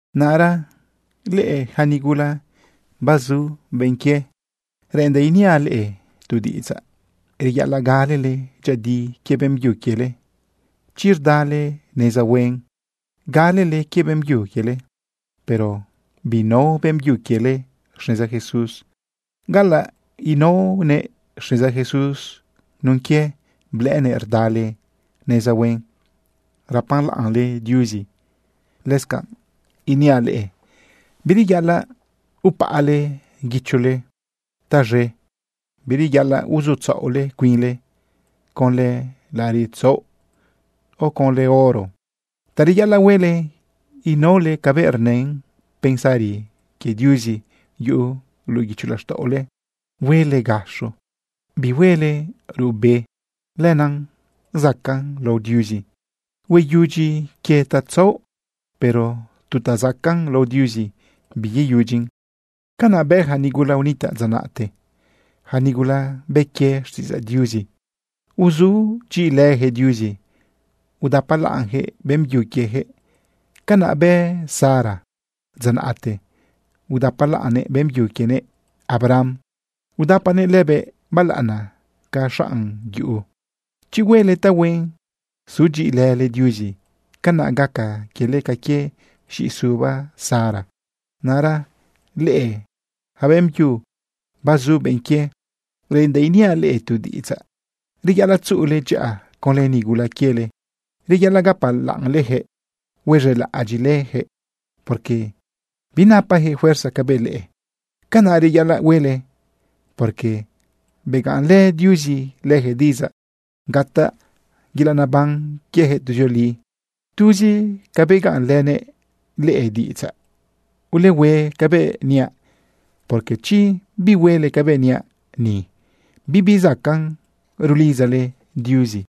Naꞌra leꞌe yaca nigula bazu benꞌ quie, reꞌendaꞌ iniaꞌ leꞌe tu diꞌidzaꞌ. Reyaꞌalaꞌ galele dyëꞌëdi quie beꞌmbyu quiele. Chi rdale neza huen galele quie beꞌmbyu quiele, pero binao beꞌmbyu quiele xneza Jesús, galaꞌ inaonëꞌ xneza Jesús nun quie blëꞌënëꞌ rdale neza huen, rapalaꞌnle Diuzi. Lëscanꞌ niaꞌ leꞌe bireyaꞌalaꞌ upaꞌale guichole taz̃e. Bireyaꞌalaꞌ uzutzaꞌole cuinle conlë laꞌariꞌ tzaoꞌ, o conlë oro. Ta reyaꞌalaꞌ huele, inaole cabëꞌ rnën pensari quie Diuzi yuꞌu luꞌu guicho laxtaꞌole. Huele gaxo, bihuele ruꞌbe. Lenaꞌ zacaꞌn lao Diuzi. Hueyudyi quie tatzaoꞌ, pero tu ta zacaꞌn lao Diuzi biyeyudyin. Canaꞌ bë ja nigula unitaꞌ dza naꞌte, yaca nigula bë quie xtiꞌidzaꞌ Diuzi. Uzudyiꞌilëjëꞌ Diuzi, udapalaꞌnjëꞌ beꞌmbyu quiejëꞌ. Canaꞌ bë Sara dza naꞌte, udapalaꞌnnëꞌ beꞌmbyu quienëꞌ, Abraham. Udapanëꞌ lëbëꞌ balaꞌana ca xanꞌ yuꞌu. Chi huele tahuen sudyiꞌilële Diuzi, canaꞌ gaca quiele ca quie z̃iꞌisuba Sara. Naꞌra leꞌe yaca beꞌmbyu bazu benꞌ quie, reꞌendaꞌ iniaꞌ leꞌe tu diꞌidzaꞌ. Reyaꞌalaꞌ tzuꞌule dyaꞌa conlë nigula quiele. Reyaꞌalaꞌ gapalaꞌnleyaquëꞌ huez̃elaꞌadyiꞌleyaquëꞌ, porque binapajëꞌ fuerza cabëꞌ leꞌe. Canaꞌ reyaꞌalaꞌ huele, porque begaꞌnlë Diuzi lëjëꞌ diꞌidzaꞌ gataꞌ yelaꞌ nebanꞌ quiejëꞌ tuzioli tuzi ca begaꞌnlënëꞌ leꞌe diꞌidzaꞌ. Ulehue cabëꞌ niaꞌ, porque chi bihuele cabëꞌ niaꞌ ni, bibi zacaꞌ rulidzale Diuzi.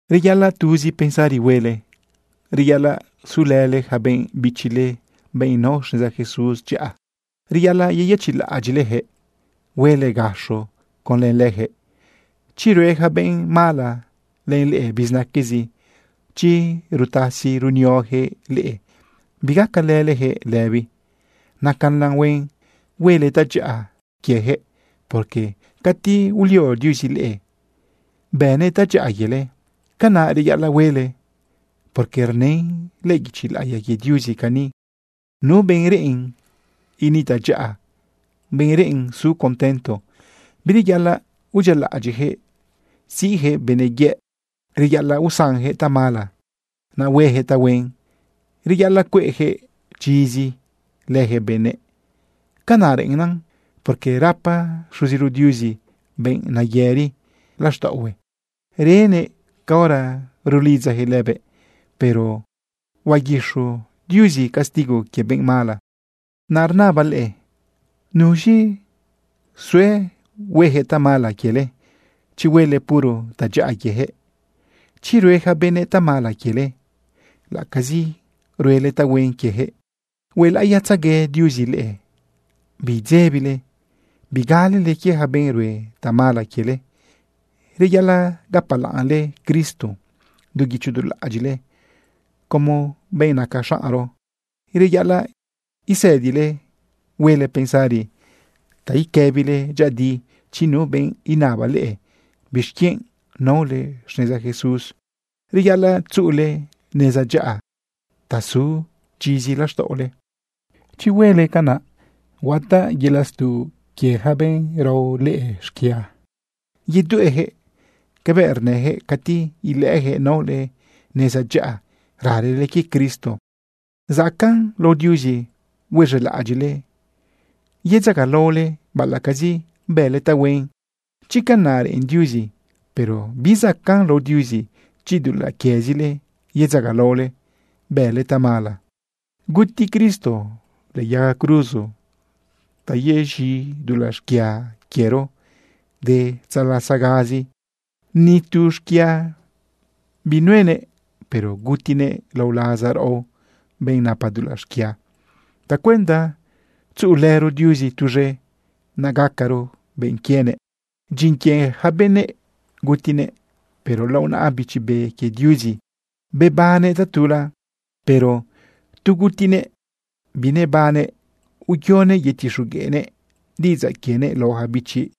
Reyaꞌalaꞌ tuzi pensari huele. Reyaꞌalaꞌ sulële yaca benꞌ bichile, benꞌ nao xneza Jesús dyaꞌa. Reyaꞌalaꞌ yeyëchiꞌlaꞌadyiꞌlejëꞌ, huele gaxo conlë lëjëꞌ. Chi rue yaca benꞌ mala len leꞌe bizinaquezi, chi rutasi runiojëꞌ leꞌe, bigacalëlejëꞌ lëbi. Nacalan huen huele tadyaꞌa quiejëꞌ, porque cati ulio Diuzi leꞌe bënëꞌ tadyaꞌa quiele. Canaꞌ reyaꞌalaꞌ huele, porque rnën lëꞌë guichi laꞌiya quie Diuzi cani: Nu benꞌ reꞌen initaꞌ dyaꞌa, benꞌ reꞌen su contento, bireyaꞌalaꞌ udyialaꞌadyiꞌjëꞌ siꞌjëꞌ benëꞌ yëꞌ. Reyaꞌalaꞌ usanjëꞌ tamala, naꞌ huejëꞌ tahuen. Reyaꞌalaꞌ cueꞌjëꞌ chizi lëjëꞌ benëꞌ. Canaꞌ reꞌennan, porque rapa Xuziro Diuzi benꞌ nayëri laxtaꞌohue, renëꞌ caora rulidzajëꞌ lëbëꞌ, pero huaguiz̃u Diuzi castigo quie benꞌ mala. Naꞌ rnabaꞌ leꞌe tu pregunta: ¿Nuz̃i sue huejëꞌ tamala quiele chi huele puro tadyaꞌa quiejëꞌ? Chi rue yaca benëꞌ tamala quiele, laꞌacazi ruele tahuen quiejëꞌ, huelaꞌiyatzegue Diuzi leꞌe. Biidzebile bigalele quie yaca benꞌ rue tamala quiele. Reyaꞌalaꞌ gapalaꞌnle Cristo du guicho du laꞌadyiꞌle como benꞌ naca xaꞌnro. Reyaꞌalaꞌ isëdile huele pensari ta iquëbile dyëꞌëdi chi nu benꞌ inaba leꞌe bixquienꞌ naole xneza Jesús. Reyaꞌalaꞌ tzuꞌule neza dyaꞌa ta su chizi laxtaꞌole. Chi huele canaꞌ, gataꞌ yelaꞌ stuꞌ quie yaca benꞌ rao leꞌe xquia. Yedueꞌjëꞌ cabëꞌ rnëjëꞌ cati ilëꞌëjëꞌ naole neza dyaꞌa, ralele quie Cristo. Zacaꞌn lao Diuzi huez̃elaꞌadyiꞌle yedzagalaole baꞌalaꞌcazi bële tahuen, chi canaꞌ reꞌen Diuzi, pero bizacaꞌn lao Diuzi, chi dulaꞌ quiezile yedzagalaole bële tamala. Guti Cristo lëꞌë yaga cruzo ta yez̃i dulaꞌ xquia quiero de tzalasagazi. Ni tu xquia binuenëꞌ, pero gutinëꞌ lao laza raꞌo, benꞌ napa dulaꞌ xquia, tacuenda tzuꞌulëro Diuzi tuz̃e, naꞌ gacaro benꞌ quienëꞌ. Dyin quie yaca benëꞌ gutinëꞌ, pero lao naꞌa Bichi Be quie Diuzi bebannëꞌ tatula. Pero tu gutinëꞌ binebannëꞌ uyonëꞌ yetixogueꞌnëꞌ diꞌidzaꞌ quienëꞌ lao ja bichi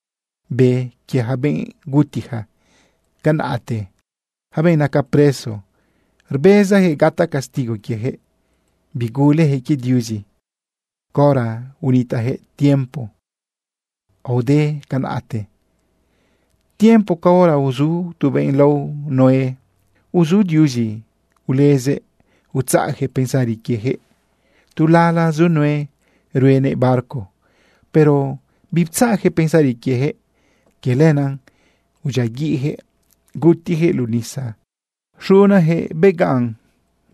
be quie yaca benꞌ gutija canaꞌte, yaca benꞌ naca preso rbezajëꞌ gataꞌ castigo quiejëꞌ. Bigulejëꞌ quie Diuzi caora unitaꞌjëꞌ tiempo aode canaꞌte, tiempo caora uzu tu benꞌ lao Noé. Uzu Diuzi ulezëꞌ utzaꞌyaquëꞌ pensari quiejëꞌ tu lala zu Noé ruenëꞌ barco, pero biptzaꞌjëꞌ pensari quiejëꞌ. Quie lenaꞌ udyiaguiꞌjëꞌ gutijëꞌ luꞌu nisa. Xunayaquëꞌ begaꞌn,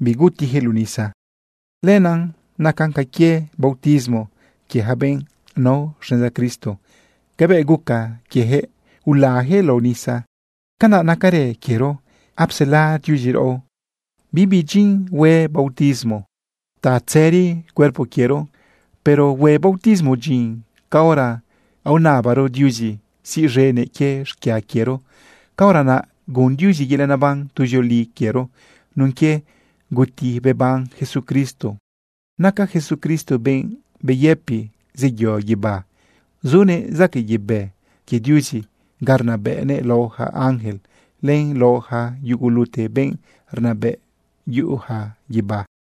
bigutijëꞌ luꞌu nisa. Lenaꞌ nacan ca quie bautismo quie ja benꞌ nao xneza Cristo. Cabëꞌ guca quieyaquëꞌ ulayaquëꞌ lao nisa, canaꞌ nacarë quiero, apsela Diuzi raꞌo. Bibi dyin hue bautismo ta tzëri cuerpo quiero, pero hue bautismo dyin caora aonabaro Diuzi siꞌz̃enëꞌ quie xquia quiero. Caora naꞌ gun Diuzi yelaꞌ neban tuzioli quiero nun quie guti beban Jesucristo. Naca Jesucristo benꞌ beyëpi zeyo guibá. Zunëꞌ zaquëꞌ yebë quie Diuzi ga rnabëꞌnëꞌ lao ja ángel len lao ja yugulute benꞌ rnabëꞌ yuꞌuja guibá.